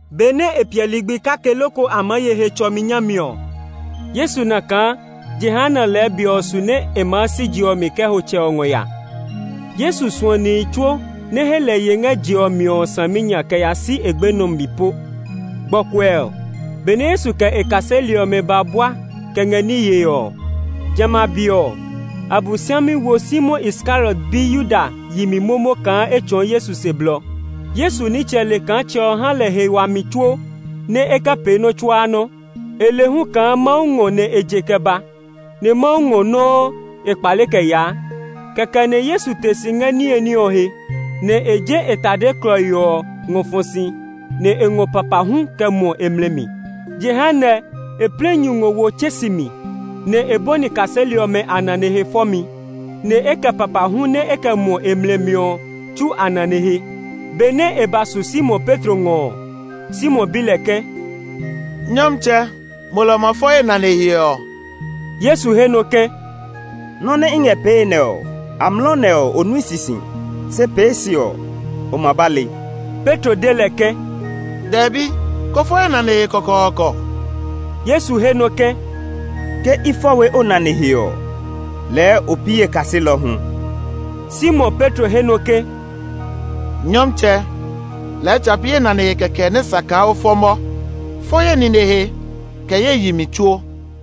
Benɛ e piɛ ligbi kake loko a maa ye Hetsɔmi nyami ɔ, Yesu na kaa jehanɛ lɛɛ be ɔ su nɛ e ma si je ɔ mi kɛ ho Tsɛ ɔ ngɔ ya. Yesu suɔ nihi tsuo nɛ he lɛ ye ngɛ je ɔ mi ɔ saminya kɛ ya si e gbenɔ mi po. Gbɔkuɛ, benɛ Yesu kɛ e kaseli ɔmɛ ba bua kɛ ngɛ ní yee ɔ, jamɛ a be ɔ, Abosiami wo Simon Iskariot bi Yuda yi mi momo kaa e tsɔɔ Yesu se blɔ. Yesu nitsɛ le kaa Tsɛ ɔ ha lɛ he wami tsuo nɛ e kɛ pee nɔ́ tsuaa nɔ́. E le hu kaa Mawu ngɔ nɛ e je kɛ ba, nɛ Mawu ngɔ nɔuu e kpale kɛ yaa. Kɛkɛ nɛ Yesu te si ngɛ niye ní ɔ he; nɛ e je e tade klɔii ɔ ngɔ fɔ si, nɛ e ngɔ papahu kɛ muɔ e mlɛ mi. Jehanɛ e plɛ nyu ngɔ wo tsɛ̃si mi, nɛ e bɔni kaseli ɔmɛ a nane he fɔmi; nɛ e kɛ papahu nɛ e kɛ muɔ e mlɛ mi ɔ tsu a nane ɔ he. Benɛ e ba su Simon Petro ngɔ ɔ, Simon bi lɛ ke, “Nyɔmtsɛ, mo lɛ o ma fɔ ye nane he ɔ?” Yesu he nɔ ke, “Nɔ nɛ i ngɛ pee nɛ ɔ, amlɔ nɛ ɔ, o nui sisi; se pee se ɔ, o ma ba le.” Petro de lɛ ke, “Dɛbi, ko fɔ ye nane he kɔkɔɔkɔ.” Yesu he nɔ ke, “Ke i fɔ we o nane he ɔ lɛɛ o pi ye kaselɔ hu.” Simon Petro he nɔ ke, “Nyɔmtsɛ, lɛɛ tsa pi ye nane he kɛkɛ nɛ sa kaa o fɔ mɔ; fɔ ye nine he, kɛ ye yi mi tsuo.”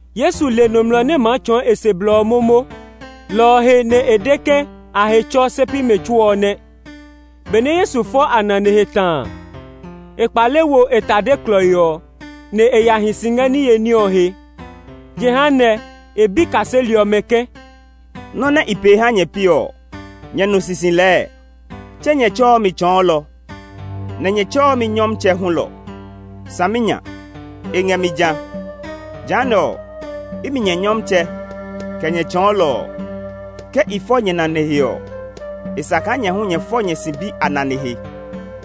Yesu le nɔmlɔ nɛ maa tsɔɔ e se blɔ ɔ momo, lɔ ɔ he nɛ e de ke a he tsɔ se pi mɛ tsuo ɔ nɛ. Benɛ Yesu fɔ a nane he ta a, e kpale wo e tade klɔii ɔ, nɛ e ya hi si ngɛ niye ní ɔ he. Jehanɛ e bi kaseli ɔmɛ ke, “Nɔ́ nɛ i pee ha nyɛ piɔ ɔ, nyɛ nu sisi lɛɛ? Tse nyɛ tsɛɔ mi Tsɔɔlɔ, nɛ nyɛ tsɛɔ mi Nyɔmtsɛ hulɔ! Saminya, e ngɛ mi jã. Jehanɛ ɔ, imi nyɛ Nyɔmtsɛ, kɛ nyɛ Tsɔɔlɔ ɔ, ke i fɔ nyɛ nane he ɔ, e sa kaa nyɛ hu nyɛ fɔ nyɛ sibi a nane he.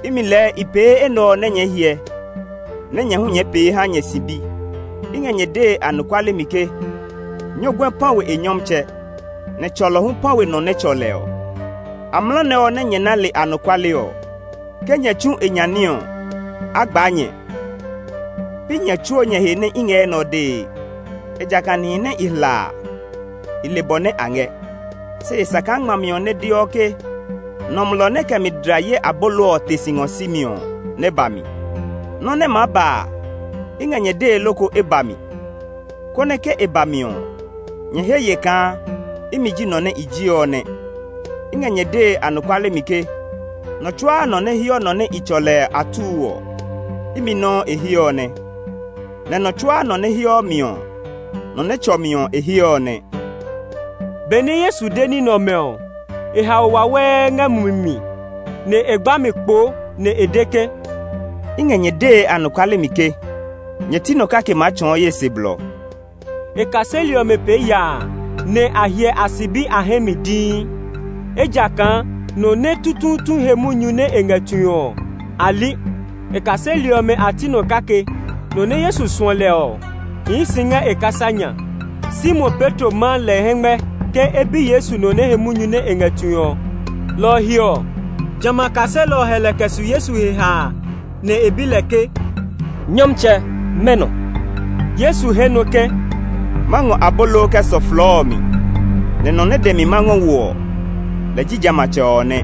Imi lɛɛ i pee enɛ ɔ nɛ nyɛɛ hyɛ, nɛ nyɛ hu nyɛ pee ha nyɛ sibi. I ngɛ nyɛ dee anɔkuale mi ke nyɔguɛ pã we e nyɔmtsɛ, nɛ tsɔlɔ hu pã we nɔ nɛ tsɔ lɛ ɔ. Amlɔ nɛ ɔ nɛ nyɛ na le anɔkuale ɔ, ke nyɛ tsu e nya ní ɔ, a gbaa nyɛ! “Pi nyɛ tsuo nyɛ he nɛ i ngɛ enɛ ɔ dee; ejakaa nihi nɛ i hla a, i le bɔ nɛ a ngɛ. Se e sa kaa ngmami ɔ nɛ deɔ ke, ‘Nɔmlɔ nɛ kɛ mi dla ye abolo ɔ te si ngɔ si mi,’ ɔ nɛ ba mi. Nɔ́ nɛ maa ba a, i ngɛ nyɛ dee loko e ba mi, konɛ ke e ba mi ɔ, nyɛ he ye kaa ‘Imi ji nɔ nɛ i ji ɔ nɛ.’ I ngɛ nyɛ dee anɔkuale mi ke, nɔ tsuaa nɔ nɛ heɔ nɔ nɛ i tsɔ lɛ atuu ɔ, imi nɔuu e he ɔ nɛ; nɛ nɔ tsuaa nɔ nɛ heɔ mi ɔ, nɔ nɛ tsɔ mi ɔ e he ɔ nɛ.” Benɛ Yesu de ní nɛ ɔmɛ ɔ, e hao wawɛɛ ngɛ mumi mi; nɛ e gba mi kpoo nɛ e de ke, “I ngɛ nyɛ dee anɔkuale mi ke, nyɛ ti nɔ kake maa tsɔɔ ye se blɔ.” E kaseli ɔmɛ pee yaa, nɛ a hyɛ a sibi a hɛ mi dii; ejakaa nɔ nɛ tutuutu he munyu nɛ e ngɛ tue ɔ, a li. E kaseli ɔmɛ a ti nɔ kake, nɔ nɛ Yesu suɔ lɛ ɔ, hii si ngɛ e kasa nya. Simon Petro ma lɛ hɛngmɛ ke e bi Yesu nɔ nɛ he munyu nɛ e ngɛ tue ɔ. Lɔ ɔ he ɔ, jamɛ a kaselɔ ɔ hɛ lɛ kɛ su Yesu he haa, nɛ e bi lɛ ke, “Nyɔmtsɛ, mɛnɔ?” Yesu he nɔ ke, “Ma ngɔ abolo kɛ sɔ flɔɔ ɔ mi; nɛ nɔ nɛ dɛ mi nɛ ma ngɔ wo ɔ, lɛ ji jamɛatsɛ ɔ nɛ.”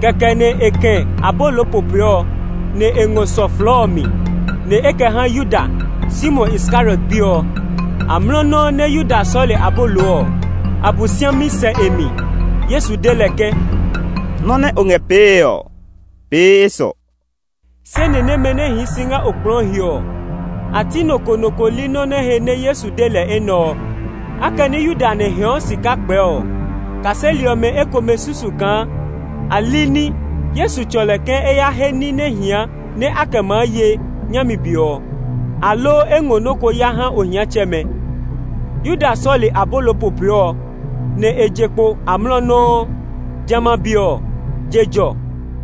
Kɛkɛ nɛ e kɛ̃ abolo popoe, nɛ e ngɔ sɔ flɔɔ ɔ mi; nɛ e kɛ ha Yuda, Simon Iskariot bi ɔ. Amlɔ nɔuu nɛ Yuda sɔle abolo ɔ, Abosiami sɛ e mi. Yesu de lɛ ke, “Nɔ nɛ o ngɛ pee ɔ, pee esɔ.” Se ni nɛmɛ nɛ hii si ngɛ okplɔɔ ɔ he ɔ, a ti nɔ ko nɔ ko li nɔ́ nɛ he nɛ Yesu de lɛ enɛ ɔ. Akɛnɛ Yuda nɛ hɛɛɔ sika kpɛɛ ɔ, kaseli ɔmɛ ekomɛ susu kaa alini Yesu tsɔ lɛ ke e ya he ní nɛ hia nɛ a kɛ maa ye nyami be ɔ, aloo e ngɔ nɔ́ ko ya ha ohiatsɛmɛ. Yuda sɔle abolo popoe ɔ, nɛ e je kpo amlɔ nɔuu. Jamɛ a be ɔ, je jɔ.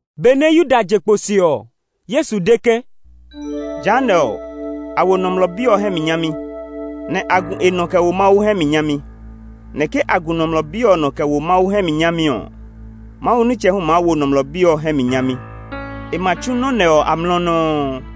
Benɛ Yuda je kpo se ɔ, Yesu de ke, “Jehanɛ ɔ, a wo Nɔmlɔ Bi ɔ hɛ mi nyami; nɛ a gu e nɔ kɛ wo Mawu hɛ mi nyami. Nɛ ke a gu Nɔmlɔ Bi ɔ nɔ kɛ wo Mawu hɛ mi nyami ɔ, Mawu nitsɛ hu maa wo Nɔmlɔ Bi ɔ hɛ mi nyami. E ma tsu nɔ́ nɛ ɔ amlɔ nɔuu.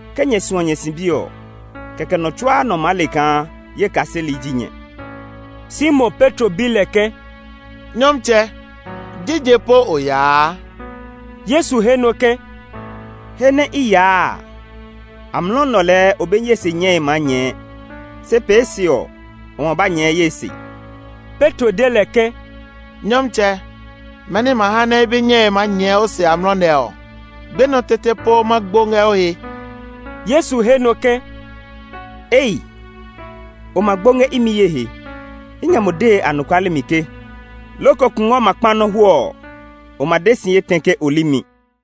Ke nyɛ suɔ nyɛ sibi ɔ, kɛkɛ nɔ tsuaa nɔ maa le kaa ye kaseli ji nyɛ.” Simon Petro bi lɛ ke, “Nyɔmtsɛ, jije po o yaa?” Yesu he nɔ ke, “He nɛ i yaa a, amlɔ nɛ ɔ lɛɛ o be ye se nyɛe maa nyɛɛ; se pee se ɔ, o ma ba nyɛɛ ye se.” Petro de lɛ ke, “Nyɔmtsɛ, mɛni ma ha nɛ i be nyɛe ma nyɛɛ o se amlɔ nɛ ɔ? Gbenɔ tete po ma gbo ngɛ o he.” Yesu he nɔ ke, “Ei! O ma gbo ngɛ imi ye he? I ngɛ mo dee anɔkuale mi ke, loko kungwɔ ma kpa nɔ hwɔɔ ɔ, o ma de si etɛ ke o li mi.”